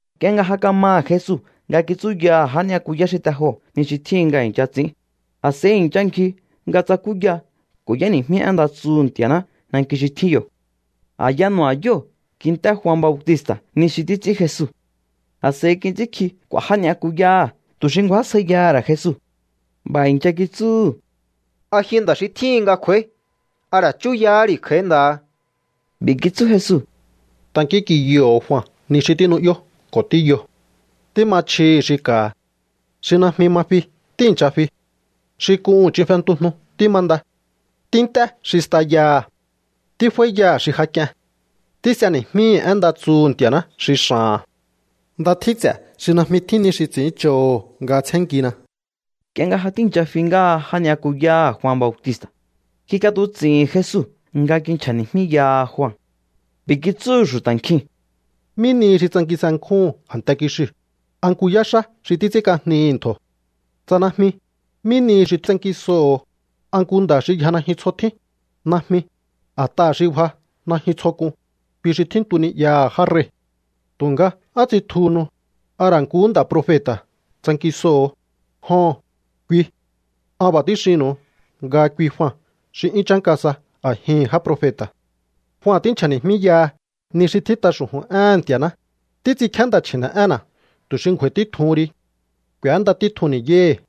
Nk'ie nga ja kamaha̱ Jesu nga kitsúyaha̱ já ni'yakuyá xi te joo̱ ni xi tjíhin nga i̱ncha ts'i̱ín, a̱s'a̱i i̱ncha ngji nga tsakúya ko̱ y'éni̱jmí én nda tsuhu̱ Nti̱a̱ná nanki xi tjín yo̱. A̱ya nu̱ba̱yóo̱ kint'é Jua Bautista̱ ni xi títs'ín Jesu. A̱s'a̱i kits'ínkji k'u̱a̱ já ni'yakuyáha̱ tu̱ xi ngju̱ásjaiyaha̱ ra̱ Jesu. B'a̱ i̱ncha kitsúhu̱: —¿A ji nda̱ xi tjíhin nga kj'u̱a̱í? ¿A ra̱ chúyahá ri̱ kj'a̱í nda̱ha? B'i̱ kitsú Jesu: —Tankínk'inyoho̱o Jua ni xi tínu'yó ko̱ tíyo. Tíma chjihi̱ xi ka̱ha̱. Xi najmi ma fi tíi̱ncha fi. Xi k'uhu̱n ch'in fentujnu tímanda. Tínt'é xi stayaha̱. Tíf'áíyaha̱ xi ja k'ien. Tís'eni̱jmíhi̱ én nda tsuhu̱ Nti̱a̱ná xi x'a̱ha̱n. ¡Nda tjín ts'e̱ xi najmi tjín ni xi ts'i̱ínch'oho̱ nga tsjénnkina! Nk'ie nga ja tíi̱ncha fi ngáha já ni'yakuyáha̱ Jua Bautista̱, kik'atuts'i̱hi̱n Jesu nga kinchja̱ni̱jmíyaha Jua. B'i̱ kitsúhu̱ xu̱ta̱ nkjiu̱n: —¿Mí nihi xi tsankinse nkjúhu̱un a̱nte kixiu̱? ¿A nku yáxá xi títs'ínk'ajnihi̱ ntjo̱? Tsa najmi, ¿mí nihi xi tsankisoho̱o? ¿A nku nda̱ xi yja najyun tsjo tjín? Najmi, a̱t'aha̱ xi bja najyun tsjo k'un, kui xi tjíntu ni'yaha̱ já rei̱. Tu̱nga, ¿á tsitjuhunu? ¿A ra̱ nkuhú nda̱ profeta̱ tsankisoho̱o? Joho̱n, kui. An b'a̱ tíxinnu̱u nga kui Jua xi 'yún chánka sa a̱jihi̱n já profeta̱. Jua tínchja̱ni̱jmíyaha ni xi tjít'a xu̱ju̱n éhe̱n Nti̱a̱ná: Títs'inkjíá nda̱ chji̱ne̱'énna̱ tu̱ xi ngju̱a̱i̱ títjuhun ri. K'u̱énda títjun ni̱yáhi̱.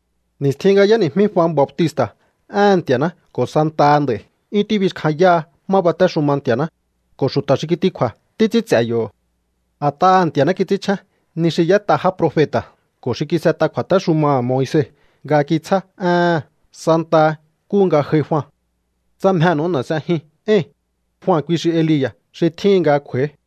’Ni̱stjin nga y'éni̱jmí Jua Bautista̱ éhe̱n Nti̱a̱ná ko̱ santaha nd'a̱i̱ 'yún tíbixkjanyáha má batéxuma Nti̱a̱ná, ko̱ xu̱ta̱ xi kitikju̱a̱ títs'ín ts'e̱ yo̱. A̱t'aha̱ Nti̱a̱ná kits'ínchjén ni xi y'ét'a já profeta̱ ko̱ xi kis'et'a kju̱a̱téxumaha̱ Moise nga kitsjá éhe̱n santaha nkúhu nga j'ai Jua. Tsa mjenu̱u n'e̱ s'ejiun éi̱n, Jua kui xi Elia̱ xi tjíhin nga kj'u̱a̱í.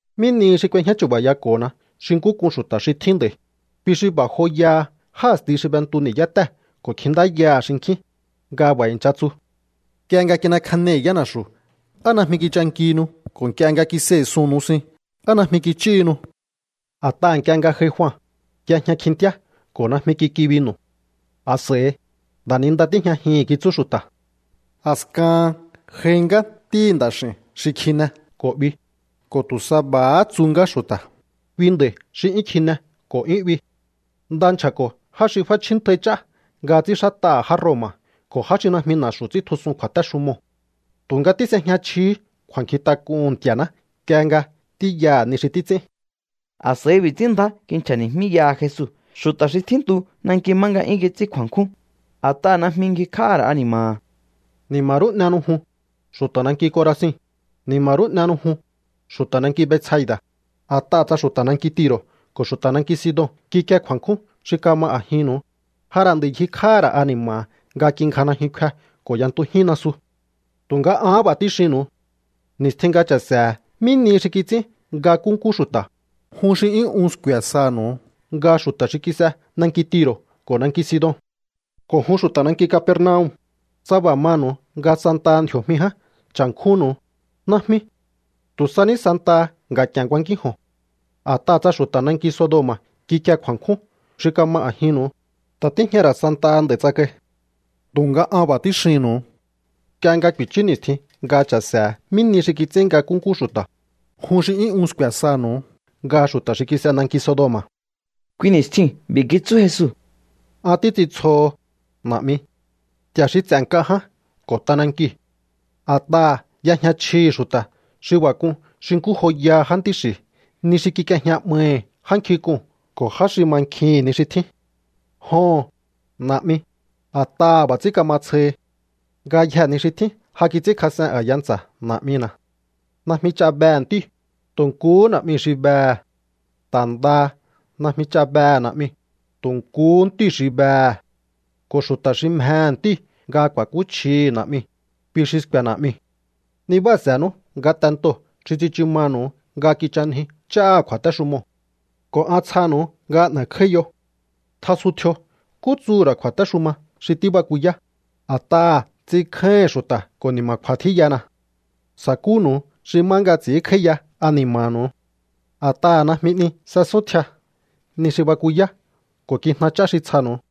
’¿Mí nihi xi k'uejñá chu̱ba̱yako̱hona xi nkú k'un xu̱ta̱ xi tjín nd'a̱i̱? Kui xi b'a̱ joyaha já a̱sti xi b'entu ni̱yátée̱ ko̱ kjintáyaha̱ xinkjín nga b'a̱ i̱ncha tsu: “Nk'ie nga kin'ekjanei̱ yána̱xu̱, ¿á najmi kichankihinu? Ko̱ nk'ie nga kisei̱ suu̱n nusin, ¿á najmi kich'íhinu?” ’A̱t'aha̱ nk'ie nga j'ai Jua, y'ejña kjintíá ko̱ najmi kik'i binu̱. A̱s'a̱i: “Nda̱ninda tíjñajihi̱n”, kitsú xu̱ta̱. A̱skahan j'ai ngá Ntíhi̱ Nda̱x'i̱u̱n xi kjine ko̱ 'bi, ko̱ tu̱ sa b'a̱há tsu ngá xu̱ta̱: “Kui nda̱i̱ xi 'yún kjine ko̱ 'yún 'bi. Nda nchja̱ko̱ já xi f'áchjíntjai ch'á nga ts'ínxát'aha̱ já Roma̱ ko̱ já xi najmi na̱xu̱ ts'íntjusun kju̱a̱téxumoo̱.” Tu̱nga tís'ejña chjihí kju̱a̱nkjintak'uhu̱n Nti̱a̱ná nk'ie nga tíyaha̱ ni xi títs'ín. A̱s'a̱i b'i̱ ts'ín ndjá kinchja̱ni̱jmíyaha Jesu xu̱ta̱ xi tjíntu nanki má nga 'yún kits'ín kju̱a̱nkjún, a̱t'aha̱ najmi ngjikj'áha̱ ra̱ ani̱ma̱ha̱: —¡Ni̱ma̱ rú n'ehenu jun, xu̱ta̱ nanki Corazin! ¡Ni̱ma̱ rú n'ehenu jun, xu̱ta̱ nanki Betsaida̱! A̱t'aha̱ tsa xu̱ta̱ nanki Tiro̱ ko̱ xu̱ta̱ nanki Sidon kikie kju̱a̱nkjún xi kama a̱jinnu̱u, ja ra̱ nd'a̱i ngjikj'áha̱ ra̱ ani̱ma̱ha̱ nga kingja najyun kfe ko̱ y'entujín nasu. Tu̱nga ahán b'a̱ tíxinnu̱u. Ni̱stjin nga cha̱se̱he̱ mí nihi xi kits'ín nga nkúnkú xu̱ta̱, jun xi 'yún un sku̱e̱ sanu̱u nga xu̱ta̱ xi kis'e nanki Tiro̱ ko̱ nanki Sidon. ’Ko̱ jun xu̱ta̱ nanki Capernaum, tsa b'a̱ manu̱u nga santaha ndji̱o̱jmi ján cha̱nkjúnnu̱u, najmi. Tu̱ sa ní santaha nga̱k'i̱e̱n kuankínjo̱on. A̱t'aha̱ tsa xu̱ta̱ nanki Sodoma̱ kikie kju̱a̱nkjún xi kama a̱jinnu̱u, ta̱ tíjña ra̱ santaha nd'a̱i̱ tsakai. Tu̱nga an b'a̱ tíxinnu̱u. Nk'ie nga ku̱i̱chú ni̱stjin nga cha̱se̱he̱ mí nihi xi kits'ín nga nkúnkú xu̱ta̱, jun xi 'yún un sku̱e̱ sanu̱u nga xu̱ta̱ xi kis'e nanki Sodoma̱. Kui ni̱stjiu̱n b'i̱ kitsú Jesu: —An títs'intsjoho, Na̱'mi, Nti̱a̱ xi ts'e̱ nk'a ján ko̱ t'anankiu̱. A̱t'aha̱ y'ejña chjihi̱ xu̱ta̱ xi b'a̱ k'un xi nkú joyaha jántí xi̱ ni xi kik'iejña 'maihi̱ já nkjink'uu̱n ko̱ já xi mankjihi̱n ni xi tjín. Joho̱n, Na̱'mi, a̱t'aha̱ b'a̱ ts'ín kama tsjohi. ’Ngayjee̱ ni xi tjín ja kits'ínkjas'en a̱ya ntsa̱ Na̱'mina̱. Najmi ch'a behe̱ Ntíu̱, tu̱ nkuhú Na̱'miu̱ xi behe̱. Ta̱ ndaha najmi ch'a behe̱ Na̱'miu̱, tu̱ nkuhú Ntíu̱ xi behe̱. Ko̱ xu̱ta̱ xi mjehe̱ Ntíu̱ nga ku̱a̱kúchjihi̱ Na̱'miu̱, kui xi sku̱e̱ Na̱'miu̱. ’Nibáha̱se̱nú ngatentoo̱ xi tsichu manu̱u nga kich'anjiu ch'áha̱ kju̱a̱téxumoo̱, ko̱ an tsjanu̱u nga n'e̱kj'áíyo. Tjasuntjio nkú tsuhu̱ ra̱ kju̱a̱téxuma xi tíbakuyá, a̱t'aha̱ ts'inkjáíhi̱n xu̱ta̱ ko̱ ni̱ma̱kju̱a̱ tjíyana. Sa̱kúnu̱u xi má nga ts'i̱ínkj'áíya ani̱ma̱nu̱u. A̱t'aha̱ najmi 'ni s'esúntjia ni xi bakuyá ko̱ kijna ch'á xi tsjanu̱u.